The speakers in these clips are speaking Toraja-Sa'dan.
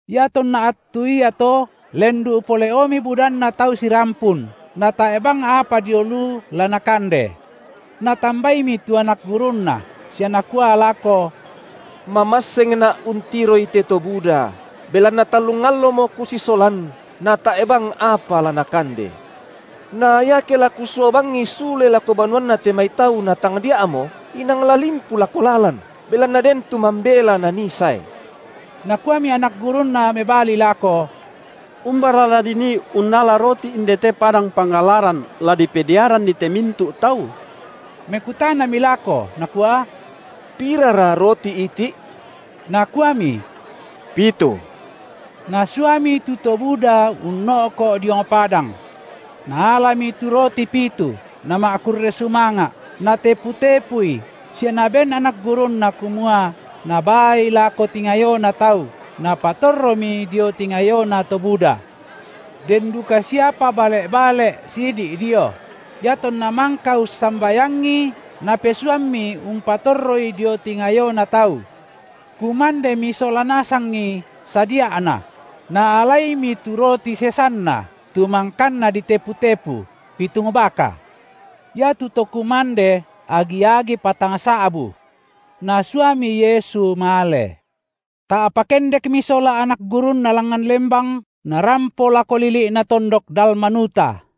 Iatonna attu iato lendu’ pole’omi budanna tau sirampun, natae’ bang apa dio lu la nakande. Natambaimi tu anak gurunNa sia nakua lako: MamassengNa’ untiroi te to buda, belanna tallung allomo Kusisolan natae’ bang apa la nakande. Na iake la Kusua bangi sule lako banuanna te mai tau natangdia’mo, inang la limpu lako lalan, belanna den tu mambela nanii sae. Nakuami anak gurunNa mebali lako: Umbara la dinii unnala roti indete padang pangallaran la dipediaranni te mintu’ tau? Mekutanami lako Nakua: Pirara roti iti’? Nakuami: Pitu. Nasuami tu to buda unno’ko’ diong padang. Naalami tu roti pitu, Nama’kurre sumanga’, Natepu-tepui sia Naben anak gurunNa kumua nabaai lako tingayona tau, napatorromi dio tingayona to buda. Den duka siapa bale’-bale’ sidi’ dio. Iatonna mangka ussambayangi, Napesuammi umpatorroi dio tingayona tau. Kumandemi sola nasangi sadia’na; naalaimi tu roti sesanna tu mangkanna ditepu-tepu, pitung baka. Iatu to kumande agi-agi patangsa’bu. Nasuami Yesu male. Ta’pa kendekmi sola anak gurunNa langngan lembang, Narampo lako lili’na tondok Dalmanuta.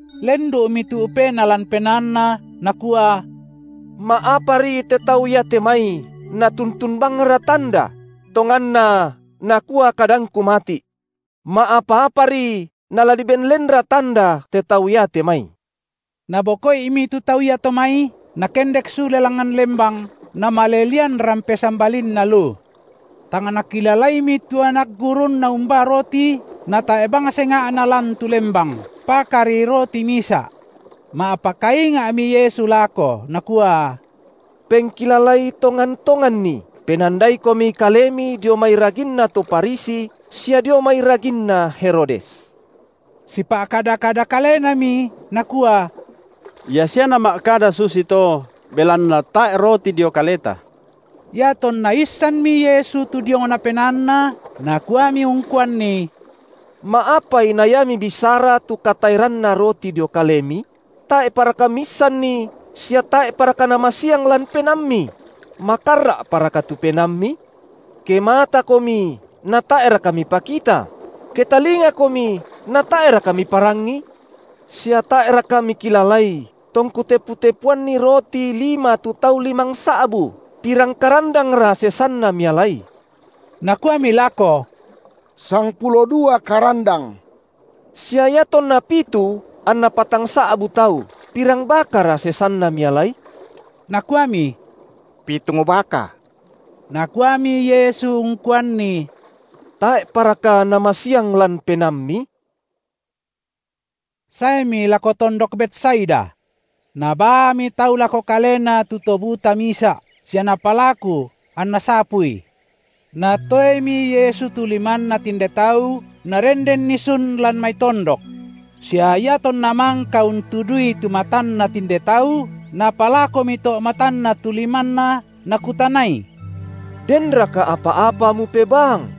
Lendu’mi tu’pena lan penaanNa, Nakua: Ma’apari te tau iate mai natuntun bangra tanda? Tonganna, nakua kadangKu mati’: Ma’apa-apari nala diben lenra tanda te tau iate mai! Naboko’imi tu tau iato mai, Nakendek sule langngan lembang Namale lian rampe sambalinna lu. Tang nakilalaimi tu anak gurunNa umbaa roti, natae’ bang senga’na lan tu lembang, pakari roti misa’. Ma’pakainga’mi Yesu lako Nakua: Pengkilalai tongan-tonganni, penandaikomi kalemi dio mai raginna to Farisi sia dio mai raginna Herodes. Sipa’kada-kada kalenami, nakua: Ia sia Nama’kada susito, belanna tae’ roti dio kaleta. Iatonna issanmi Yesu tu diongna penaanna, Nakuami ungkuanni: Ma’apai na ia mibisara tu kataeranna roti dio kalemi? Tae’paraka miissanni sia tae’paraka namasiang lan penaammi? Makarra’paraka tu penaammi? Kematakomi natae’raka mipakita? Ketalingakomi natae’raka miparangi? Sia tae’raka mikilalai, tongKu tepu-tepuanni roti lima tu tau limangsa’bu, pirang karandangra sesanna mialai? Nakuami lako: Sangpulo dua karan- dang. Sia iatonna pitu anna patangsa’bu tau, pirang bakara sesanna mialai? Nakuami: Pitung baka. Nakuami Yesu ungkuanni: tae’paraka namasiang lan penaammi? Saemi lako tondok Betsaida. Nabaami tau lako Kalena tu to buta misa’ sia napalaku anNa sapui. Natoemi Yesu tu limanna tinde tau, Narendenni sun lan mai tondok. Sia iatonna mangka untudui tu matanna tinde tau, Napalakomi to’ matanna tu limanNa, nakutanai: Denraka apa-apa mupebaang?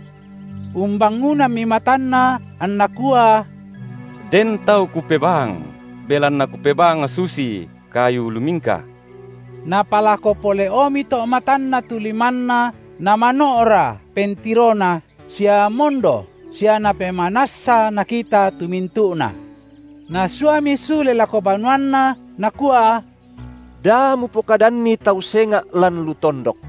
Umbangunammi matanna anna kua: Den tau kupebaang, belanna kupebaang susi kayu lumingka. Napalako pole’omi to’ matanna tu limanNa namano’ra pentirona sia mondo sia napemanassa nakita tu mintu’na. Nasuami sule lako banuanna, Nakua: Da mupokadanni tau senga’ lan lu tondok.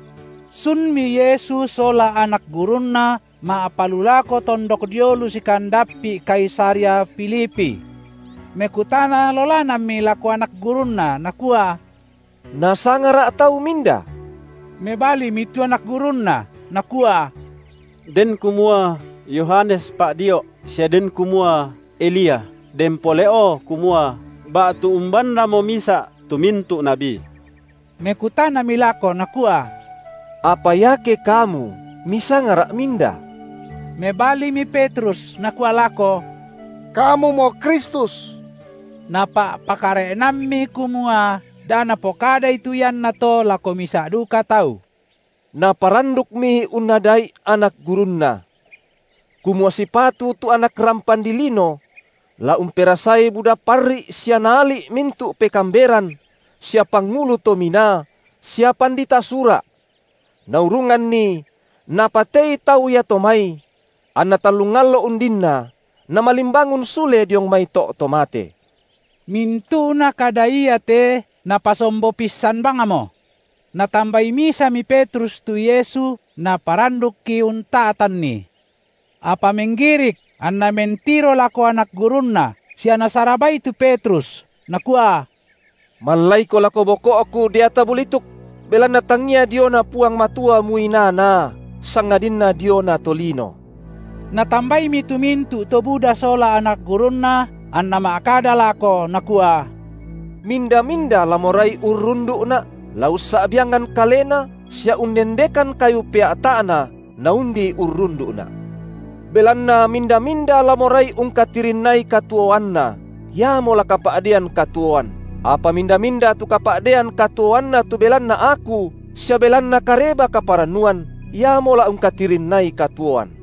Sunmi Yesu sola anak gurunNa ma’palulako tondok dio lu sikandappi’ Kaisarea Filipi. Mekutana lolanammi lako anak gurunNa, Nakua: NasangaRa’ tau minda? Mebalimi tu anak gurunNa, nakua: Den kumua: Yohanes Pa’dio’, sia den kumua: Elia, den pole’o kumua: ba’tu umbannamo misa’ tu mintu’ nabi. Mekutanami lako Nakua: Apa iake kamu, misangaRa’ minda? Mebalimi Petrus nakua lako: Kamumo Kristus. Napa’pakare’nammi kumua da napokadai tu iannato lako misa’ duka tau. Naparandukmi unnada’i anak gurunNa, kumua sipatu tu Anak rampan dilino la umperasai buda parri’ sia naali’ mintu’ pekaamberan sia pangulu to minaa sia pandita Sura’, naurunganni napatei tau iato mai anna tallung allo undinna Namalimbangun sule diong mai to’ to mate. Mintu’nate kada iate Napasombo pissan bangmo. Natambai misami Petrus tu Yesu naparandukki unta’tanNi. Apa menggirik anNa mentiro lako anak gurunNa sia Nasarabai tu Petrus, Nakua: Mallaiko lako boko’Ku deata bulituk!, belanna tangia diona Puang Matua muinaa-naa, sangadinna diona tolino. Natambaimi tu mintu’ to buda sola anak gurunNa, anNa ma’kada lako Nakua: Minda-minda la morai urrundu’Na’, la ussa’biangan kalena sia unnendekan kayu pea’ta’na naundi urrundu’Na’. Belanna minda-minda la morai ungkatirinnai katuoanna, iamo la kapa’dean katuoan, apa minda-minda tu kapa’dean katuoanna tu belanna Aku sia belanna Kareba-kaparannuan, iamo la ungkatirinnai katuoan.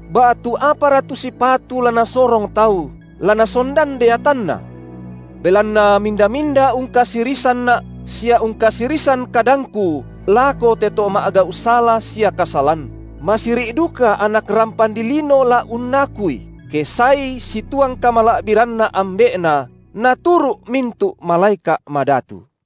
Ba’tu apara tu sipatu la nasorong tau la nasondan deatanna? Belanna minda-minda ungkasirisanNa’ sia ungkasirisan kadangKu lako te to ma’gau’ sala sia kasalan, masiri’ duka Anak rampan dilino la unnakui, ke saeI situang kamala’biranNa Ambe’Na naturu’ mintu’ malaeka’ madatu.